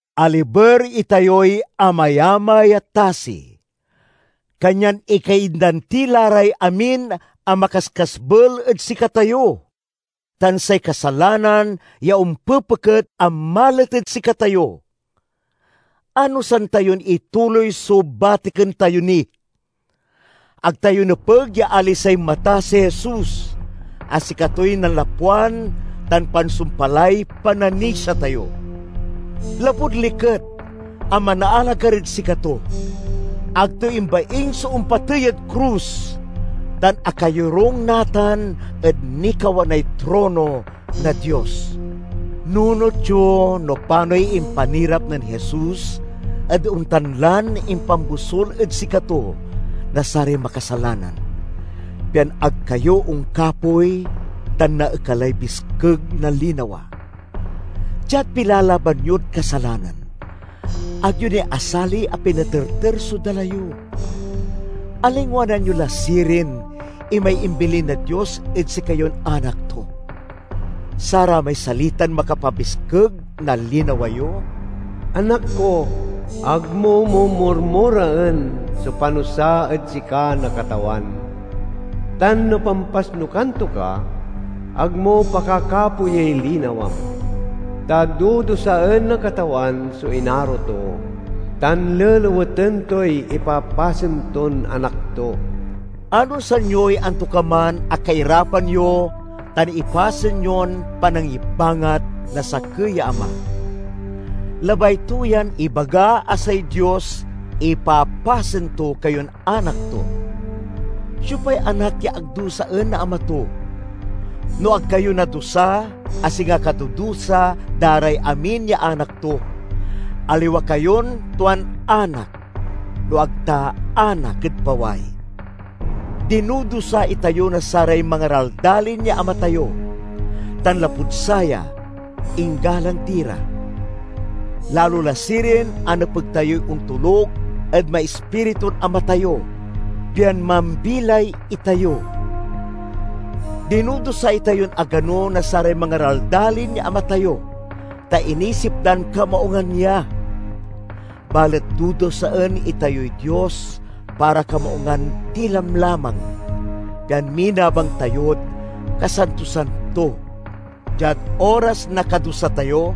Aliber itayoy amayamay a tasi, kanyan ikaindan ti la ray amin a makaskasbel ed sikatayo, tan say kasalanan ya ompepeket a malet ed sikatayo. Anosan tayon ituloy so batiken tayo ni. Ag tayo nepeg ya alisay mata si Jesus a sikatoy nanlapwan tan pansumpalay pananisia tayo. Lapud liket a manaalagar ed sikato, ag to imbaing so ompatey ed krus, tan akayorung natan ed nikawanay trono na Dios. Nunot yo no panoy impanirap nen Jesus ed ontan lan impanbosul ed sikato na saray makasalanan, pian ag kayo onkapoy tan naekalay biskeg na linawa. Diad pilalaban yod kasalanan, ag yo ni asali a pinaterter so dala yo. Alingwanan yo la sirin imay imbilin na Dios ed sikayon anak to, saramay salitan makapabiskeg na linawa yo? "Anak ko, ag mo mumurmuraen so panusa ed sika na Katawan, tan no pampasnukan to ka, ag mo pakakapoyey linawam. Ta dudusaen na Katawan so inaro to, tan leleweten toy ipapasen ton anak to." Anosan yoy antokaman a kairapan yo tan ipasen yon panangibangat na sakey ya ama. Labay to yan ibaga a say Dios ipapasen to kayon anak to. Siopay anak ya ag dusaen na ama to? No ag kayo nadusa, a singa kadudusa da ray amin ya anak to, aliwa kayon tuan anak no ag ta anak ed paway. Dinudusa itayo na saray mangaraldalin ya ama tayo tan, lapud saya, inggalang ti ra. Lalo la sirin a nepeg tayoy ontoluk ed maispiritun Ama tayo, pian mambilay itayo! Dinudusa itayon agano na saray mangaraldalin ya ama tayo, ta inisip dan kamaungan ya. Balet dudusaen itayoy Dios para kamaungan ti lamlamang, pian minabang tayod kasantosan to. Diad oras na kadusa tayo,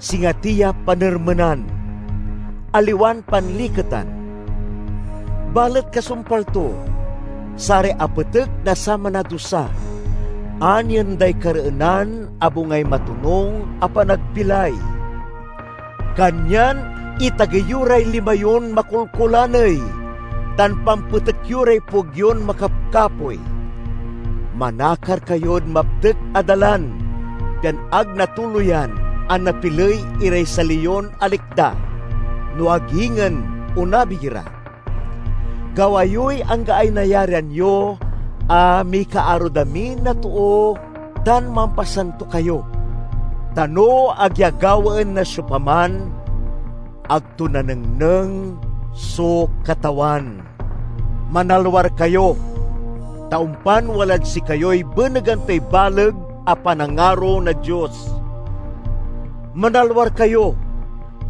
singa ti ya panermenan, aliwan panliketan. Balet kasumpal to, saray apetek na saman a dusa anien day kareenan a bungay matonung a panagbilay. Kanyan itagey yo ray lima yon makolkolaney, tan pampetek yo ray pueg yon makapkapoy! Manakar kayod maptek a dalan, pian ag natuloyan a napiley iray sali yon alikda, no ag ingen onabig ira. Gawa yoy anggaay nayarian yo a mikaarod amin a too tan mampasanto kayo, ta no ag ya gawaen na siopaman, ag to nanengneng so Katawan. Manalwar kayo, ta ompan walad sikayoy benegan toy baleg a panangaro na Dios. Manalwar kayo,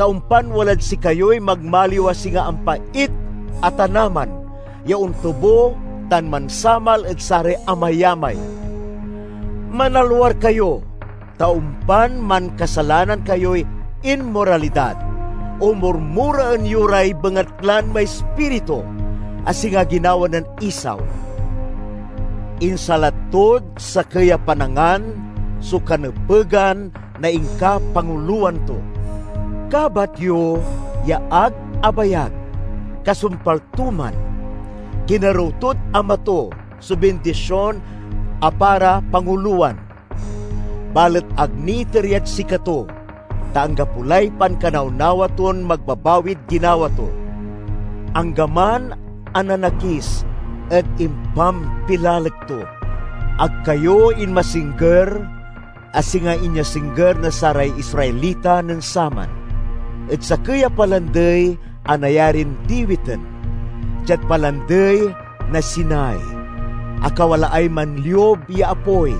ta ompan walad sikayoy magmaliw a singa ampait a tanaman ya ontubo tan mansamal ed saray amayamay. Manalwar kayo, ta ompan mankasalanan kayoy inmoralidad o murmuraen yo ray bengatlan maispiritu, a singa ginawa nen Esau. Insalat tod sakey a panangan so kanepegan na inkapangulowan to. Kabat yo ya ag abayag kasumpal to man, kinerew tod ama to so bindision a para pangulowan. Balet ag niiter yad sikato, ta anggapo lay pankanawnawa ton magbabawid ginawa to, anggaman a nanakis ed impampilalek to. Ag kayo inmasingger, a singa inyasingger na saray Israelita nen saman, ed sakey a palandey a nayarin diwiten—diad Palandey na Sinai a kawalaay manliub ya apoy,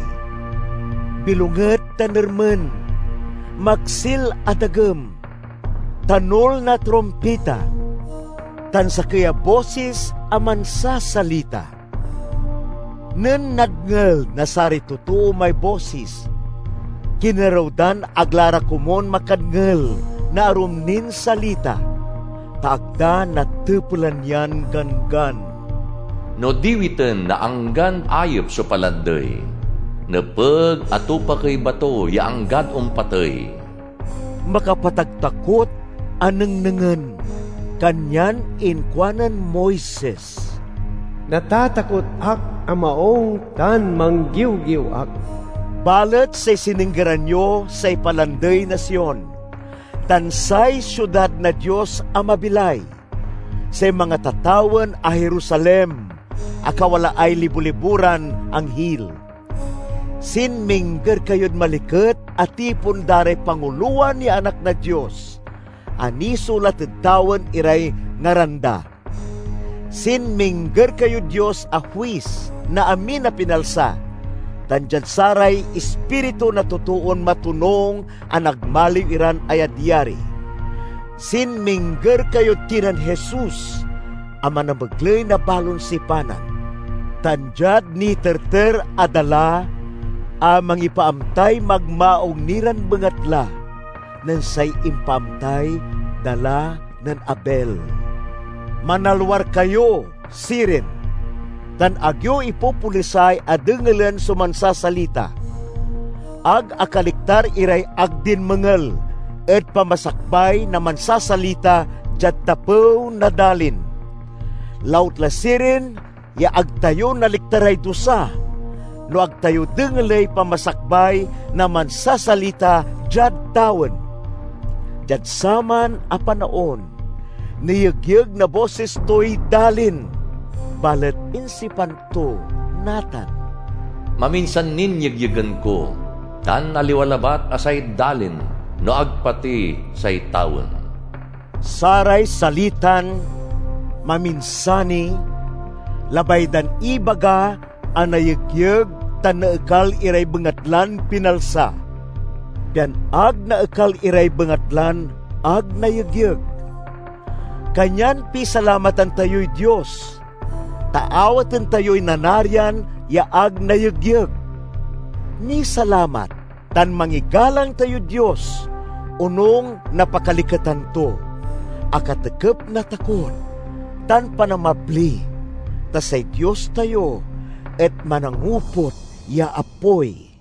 bilonget tan ermen, maksil a dagem, tanul na trumpita, tan sakey a bosis a mansasalita. Nen nadngel na saray totoo may bosis, kinerew dan ag la ra komun makadngel na arum nin salita, ta ag da natepelan yan ganggan: "No diwiten na anggan ayep so palandey, nepeg a tupakey bato ya anggad ompatey." Makapataktakot a nengnengen, kanyan inkuanen Moises, "Natatakot ak a maung, tan manggiwgiw ak!" Balet say sininggeran yo say Palandey na Sion tan say siudad na Dios a mabilay, say mangatatawen a Jerusalem, a kawalaay libo-libo ran anghil. Sinmingger kayod maliket a tipon da ray pangulowan ya anak na Dios, a nisulat ed tawen iray ngaran da. Sinmingger kayod Dios a huis na amin a pinalsa, tan diad saray ispiritu na totoon matonung a nagmaliw iran ayadyari. Sinmingger kayod kinen Jesus, a manamegley na balon sipanan, tan diad niterter a dala a mangipaamtay magmaung ni ran bengatla nen say impaamtay dala nen Abel. Manalwar kayo, sirin, tan ag yo ipopolisay a dengelen so mansasalita. Ag akaliktar iray ag dinmengel ed pamasakbay na mansasalita diad tapew na dalin. Lautla sirin ya ag tayo naliktaray dusa, no ag tayo dengeley pamasakbay na mansasalita diad tawen! Diad saman a panaon, niyegyeg na bosis toy dalin, balet insipan to natan, "Maminsan nin yegyegen ko, tan aliwa labat a say dalin no ag pati say tawen." Saray salitan "maminsan ni" labay dan ibaga a nayegyeg tan naekal iray bengatlan pinalsa, pian ag naekal iray bengatlan ag nayegyeg. Kanyan pisalamatan tayoy Dios, ta awaten tayoy nanarian ya ag nayegyeg. Misalamat tan mangigalang tayod Dios onung na pakaliketan to, a katekep na takot tan panamabli, ta say Dios tayo et manangoput ya apoy.